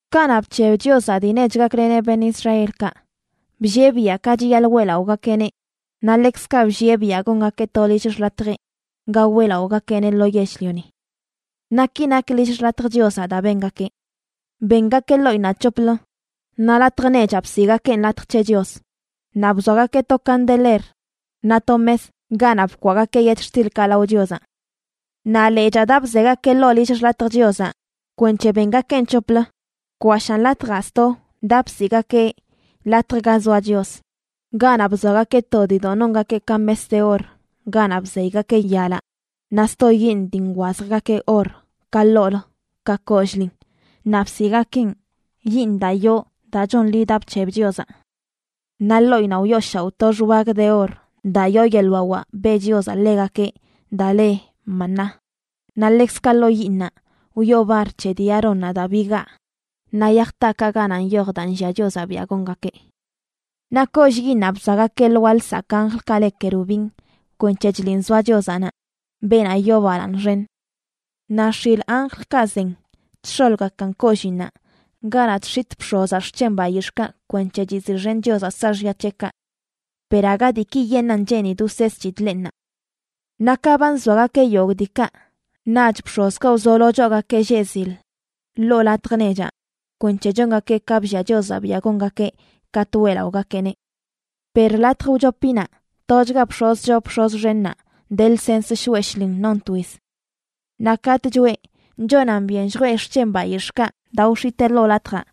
Kanaꞌ bc̱heb Chiozaꞌ dii nech gakleneꞌ beṉꞌ Israelkaꞌ, bllieꞌ biaꞌ ka chiyaḻꞌ weꞌlaꞌogakeꞌneꞌ, naꞌ ḻekzkaꞌ bllieꞌ biaꞌ gongakeꞌ to lill xḻatjeꞌ ga weꞌlaꞌogakeꞌneꞌ lo yell-lioni. Naꞌ ki nak lill xḻatj Chiozaꞌ daa bengakeꞌ: bengakeꞌ ḻoꞌinnaꞌ c̱hoplə, naꞌ latj nechaꞌ bsiꞌgakeꞌn Latj c̱he Chios, naꞌ bzoagakeꞌ to candeler naꞌ to mes ganaꞌ bkwaꞌgakeꞌ yetxtilkaꞌ lao Chiozaꞌ. Naꞌ lechaa daa bzegakeꞌ ḻoo lill xḻatj Chiozaꞌ kwenc̱he bengakeꞌn c̱hoplə bkwashaan latjaꞌ sto daa bsiꞌgakeꞌ Latj Ga Zoa Chios, ganaꞌ bzoagakeꞌ to diidoꞌ nongakeꞌ ka mes de or ganaꞌ bzeygakeꞌ yalaꞌ, naꞌ sto yiiṉ dii nwazjgakeꞌ or ka ḻoolə ka kollꞌlin, naꞌ bsiꞌgakeꞌn yiiṉ daa yoo daa chonḻi daa bc̱heb Chiozaꞌ. Naꞌ ḻoꞌinnaꞌ wyooshaoꞌ to xwag de or daa yoo yeḻꞌ wawaꞌ beꞌ Chiozaꞌ ḻegakeꞌ daa le maná, naꞌ ḻekzkaꞌ ḻoo yiiṉaꞌ wyoo bar c̱he dii Aarónnaꞌ daa bigaa, naꞌ yaj taakaꞌ ganaꞌ nyoj daa nllia Chiozaꞌ biaꞌ gongakeꞌ. Naꞌ kollꞌ yiiṉaꞌ bzoagakeꞌ lwaa lsakꞌ anjlkaꞌ le kerubin kwenc̱he chliꞌn zoa Chiozaꞌ naꞌ, beenaꞌ yoo balaaṉ xen. Naꞌ x̱il anjlkaꞌ zen chx̱olgakan kolliinnaꞌ ganaꞌ chx̱itꞌ bx̱ozaꞌ xc̱hen bayix̱ꞌkaꞌ kwenc̱he chiziꞌxen Chiozaꞌ saaxya c̱heꞌkaꞌ. Per aga diikiyeṉꞌan cheenidꞌ wseesꞌchidꞌ leꞌ ṉaa. Naꞌ ka ba nzoagakeꞌ yogꞌ diikaꞌ, naꞌch bx̱ozkaꞌ wzolo choogakeꞌ lleꞌ zil ḻoo latj nechaꞌ kwenc̱he chongakeꞌ ka bllia Chiozaꞌ biaꞌ gongakeꞌ katꞌ weꞌlaꞌogakeꞌneꞌ. Per latj wchopinaꞌ tochga bx̱oz choo bx̱oz xennaꞌ de lsens shoꞌe shlin non twiz. Naꞌ katꞌ choꞌe, chonan byen lljwee xc̱hen bayix̱ꞌkaꞌ daa wx̱itee ḻoo latjaꞌ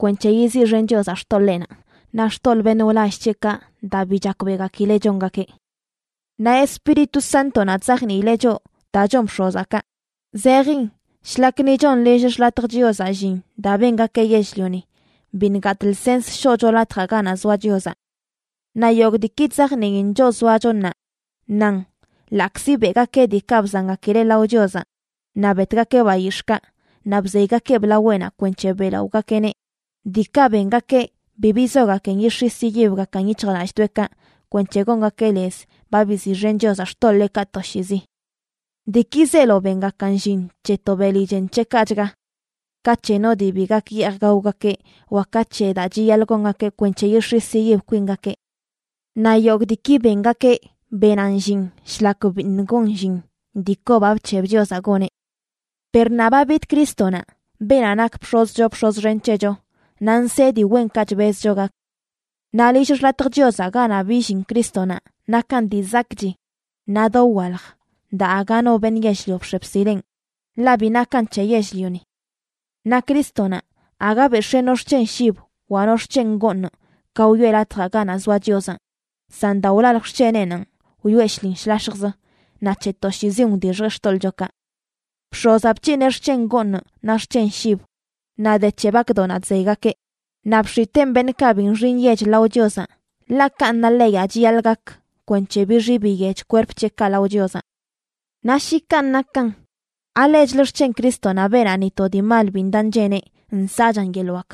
kwenc̱he yiziꞌxen Chiozaꞌ xtoḻeenaꞌ naꞌ xtoḻꞌ beṉꞌ wlall c̱heꞌkaꞌ daa bi chakbeꞌgakileꞌ chongakeꞌ. Naꞌ Espíritu Sántonaꞌ chzajniileꞌ choꞌ daa chon bx̱ozaꞌ kaꞌ zejin shlak ni chon lill xḻatj Chiozaꞌ llin daa bengakeꞌ yell-lioni, biṉꞌ gatꞌ lsens shoꞌcho Latjaꞌ Ganaꞌ Zoa Chiozaꞌ. Naꞌ yogꞌ diiki chzajniin choꞌ zoacho ṉaa nan ḻaꞌkzi beꞌgakeꞌ diikaꞌ bzangakileꞌ lao Chiozaꞌ naꞌ betgakeꞌ bayix̱ꞌkaꞌ naꞌ bzeygakeꞌb laweꞌnaꞌ kwenc̱he beꞌlaꞌogakeꞌneꞌ, diikaꞌ bengakeꞌ bi bizogakin yix̱is yiyibgakan yic̱hjlallꞌdoꞌekaꞌ kwenc̱he gongakeꞌ lez ba biziꞌxen Chiozaꞌ xtoḻeekaꞌ toshiizi. Diiki zeelo bengakan llin c̱he to beli chen c̱heꞌkaꞌchga: ka c̱he no dii bi gak yeej gaogakeꞌ wa ka c̱he daa chiyaḻꞌ gongakeꞌ kwenc̱he yix̱is yiyib kwingakeꞌ. Naꞌ yogꞌ diiki bengakeꞌ benan llin shlak biṉꞌ gon llin dii kobaꞌ bc̱heb Chiozaꞌ goneꞌ. Per ṉaa ba bid Crístonaꞌ, beenaꞌ nak bx̱oz choo bx̱oz xen c̱hecho, naꞌ nsee dii wenkaꞌ chbezcho gak. Naꞌ lill xḻatj Chiozaꞌ ganaꞌ billin Crístonaꞌ nakan dii zakꞌchi naꞌ dowalj daa aga no beṉꞌ yell-lio bx̱e bsileꞌn, ḻaꞌ bi nakan c̱he yell-lioni. Naꞌ Crístonaꞌ, aga bex̱ee no xc̱hen shib wa no xc̱hen gooṉ ka wyoꞌe Latjaꞌ ganaꞌ zoa Chiozaꞌ, san daa wlalj xc̱heneꞌnanꞌ wyoꞌe shlin shlax̱jz, naꞌ c̱he toshiizin wdixjeꞌ xtoḻꞌchokaꞌ. Bx̱ozaꞌ bc̱hineꞌ xc̱hen gooṉ naꞌ xc̱hen shib, naꞌ de c̱he bakdoꞌnaꞌ chzeygakeꞌ, naꞌ bx̱iteen beṉꞌkaꞌ bi nxi nyech lao Chiozaꞌ, ḻaꞌ kanꞌ na leyaꞌ chiyaḻꞌ gak kwenc̱he bixi biyech kwerp c̱heꞌkaꞌ lao Chiozaꞌ. Naꞌ shi kanꞌ nakan, ¿alechlə xc̱hen Crístonaꞌ, beenaꞌ ni to dii mal bi ndaꞌ ncheneꞌ, nsaꞌchan yeḻꞌ wak?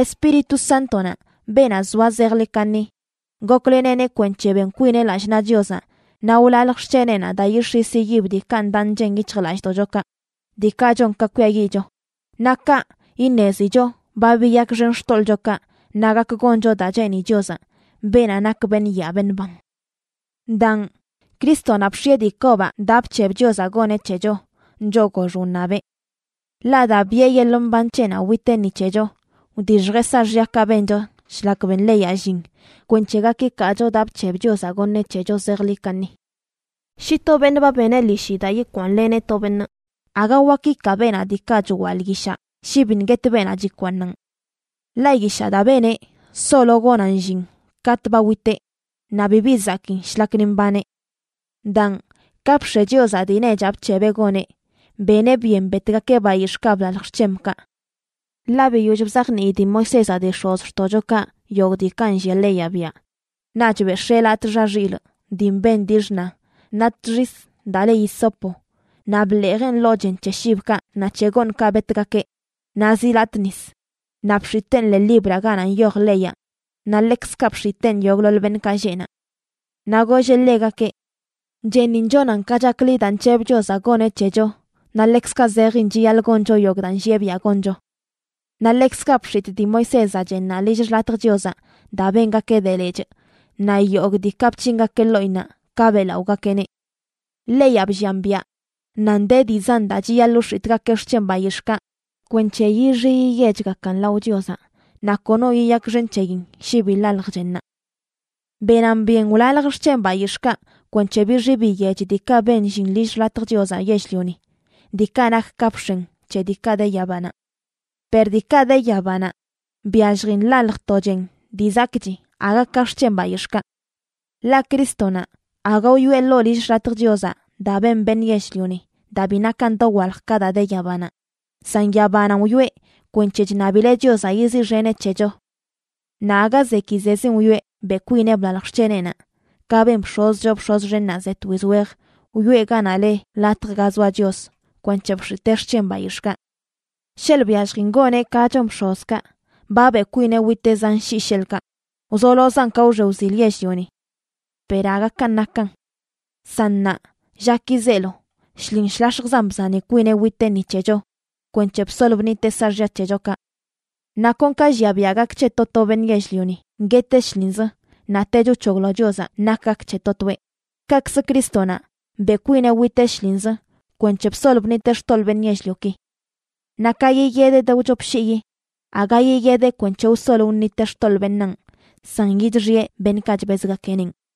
Espíritu Sántonaꞌ, beenaꞌ zoa zejḻi kaṉi, gokleneꞌneꞌ kwenc̱he ben kwineꞌ lallꞌ naꞌ Chiozaꞌ naꞌ wlalj xc̱heneꞌnaꞌ daa yix̱is yiyib diikaꞌ ndaꞌ nchen yic̱hjlallꞌdoꞌchokaꞌ, diikaꞌ chon ka kwiayiꞌcho. Naꞌ kaꞌ, iṉezicho ba biyakxen xtoḻꞌchokaꞌ naꞌ gak goncho daa cheeni Chiozaꞌ, beenaꞌ nak beṉꞌ yaa beṉꞌ ban. Daan, Crístonaꞌ bx̱ieꞌ dii kobaꞌ daa bc̱heb Chiozaꞌ goneꞌ c̱hecho, choꞌ gox wṉabeꞌ. Ḻaꞌ daa biꞌe yeḻꞌ mban c̱heꞌnaꞌ witeꞌ ni c̱hecho, wdixjeꞌ saaxyakaꞌ bencho shlak ben leyaꞌ llin, kwenc̱he gak ikaacho daa bc̱heb Chiozaꞌ goṉeꞌ c̱hecho zejḻi kaṉi. Shi to beṉꞌ ba beneꞌ ḻishi daa yikwaaṉleneꞌ to beṉꞌ, aga wak ikaa beenaꞌ diikaꞌ chwaḻꞌ yishaꞌ shi biṉꞌ guet beenaꞌ chikwaaṉan. Ḻaꞌ yishaꞌ daa beneꞌ solo gonan llin katꞌ ba witeꞌ, naꞌ bibi zakiin shlak ni mbaneꞌ. Daan, ka bx̱e Chiozaꞌ dii nechaꞌ bc̱hebeꞌ goneꞌ, beneꞌ byen betgakeꞌ bayix̱ꞌkaꞌ blalj xc̱hemkaꞌ. Ḻaꞌ biyoll bzajnii dii Moisézaꞌ dii x̱ozxtoꞌchokaꞌ yogꞌ diikaꞌ nllia leyaꞌ biaꞌ, naꞌch bex̱ee latꞌ xa xilꞌ dii mben dii xṉa naꞌ txis daa le hisopo naꞌ bḻeejeꞌn ḻoo chen c̱he shibkaꞌ naꞌ c̱he gooṉkaꞌ betgakeꞌ naꞌ zi latꞌ nis, naꞌ bx̱iteen ḻee libraꞌ ganaꞌ nyoj leyaꞌ, naꞌ ḻekzkaꞌ bx̱iteen yogꞌḻoḻ beṉꞌkaꞌ lleꞌ naꞌ. Naꞌ golleꞌ ḻegakeꞌ: “Chennin chonan ka chakḻi daa nc̱heb Chiozaꞌ goneꞌ c̱hecho naꞌ ḻekzkaꞌ zejin chiyaḻꞌ goncho yogꞌ daa nllieꞌ biaꞌ goncho.” Naꞌ ḻekzkaꞌ bx̱itꞌ dii Moisézaꞌ chennaꞌ lill xḻatj Chiozaꞌ daa bengakeꞌ de lechꞌ naꞌ yogꞌ diikaꞌ bc̱hingakeꞌ ḻoꞌinnaꞌ ka beꞌlaꞌogakeꞌneꞌ. Leyaꞌ bllian biaꞌ nan de dii zan daa chiyaḻꞌ wx̱itꞌgakeꞌ xc̱hen bayix̱ꞌkaꞌ kwenc̱he yixi yiyechgakan lao Chiozaꞌ; naꞌ kono yiyakxen c̱heyin shi bi ḻalj chennaꞌ. Benan byen wlalj xc̱hen bayix̱ꞌkaꞌ kwenc̱he bixi biyech diikaꞌ ben llin lill xḻatj Chiozaꞌ yell-lioni, diikaꞌ nak ka bx̱en c̱he diikaꞌ de yabanaꞌ. Per diikaꞌ de yabanaꞌ, byalljin ḻalj to chen dii zakꞌchi aga ka xc̱hen bayix̱ꞌkaꞌ. Ḻaꞌ Crístonaꞌ aga wyoꞌe ḻoo lill xḻatj Chiozaꞌ daa ben beṉꞌ yell-lioni daa bi nakan dowalj ka daa de yabanaꞌ, san yabananꞌ wyoꞌe kwenc̱he chṉabileꞌ Chiozaꞌ yiziꞌxeneꞌ c̱hecho. Naꞌ aga zekizezin wyoꞌe beꞌ kwineꞌ blalj xc̱heneꞌnaꞌ, ka ben bx̱oz choo bx̱oz xennaꞌ ze twiz wej wyoꞌe ganaꞌ le Latj Ga Zoa Chios kwenc̱he bx̱itee xc̱hen bayix̱ꞌkaꞌ. Sheḻꞌ byalljin goneꞌ ka chon bx̱ozkaꞌ, ba beꞌ kwineꞌ witeꞌ zan shii, sheḻꞌkaꞌ, wzolozan ka wxe wzil yell-lioni. Per aga kanꞌ nakan. San ṉaa llaki zeelo, shlin shlax̱jzan bzani kwineꞌ witeꞌ ni c̱hecho kwenc̱he bsol bṉiteꞌ saaxya c̱hechokaꞌ. Naꞌ kon ka llia biaꞌ gak c̱he to to beṉꞌ yell-lioni gueteꞌ shlinz, naꞌtech wc̱hoglo Chiozaꞌ nak gak c̱he to toeꞌ, kaꞌkzə Crístonaꞌ beꞌ kwineꞌ witeꞌ shlinzə kwenc̱he bsol bṉiteꞌ xtoḻꞌ beṉꞌ yell-lioki. Naꞌ ka yiyedeꞌ de wchop shiyi, aga yiyedeꞌ kwenc̱he wsol wṉiteꞌ xtoḻꞌ beṉaan, san yidixiꞌe beṉꞌkaꞌ chbezgakeꞌnenꞌ.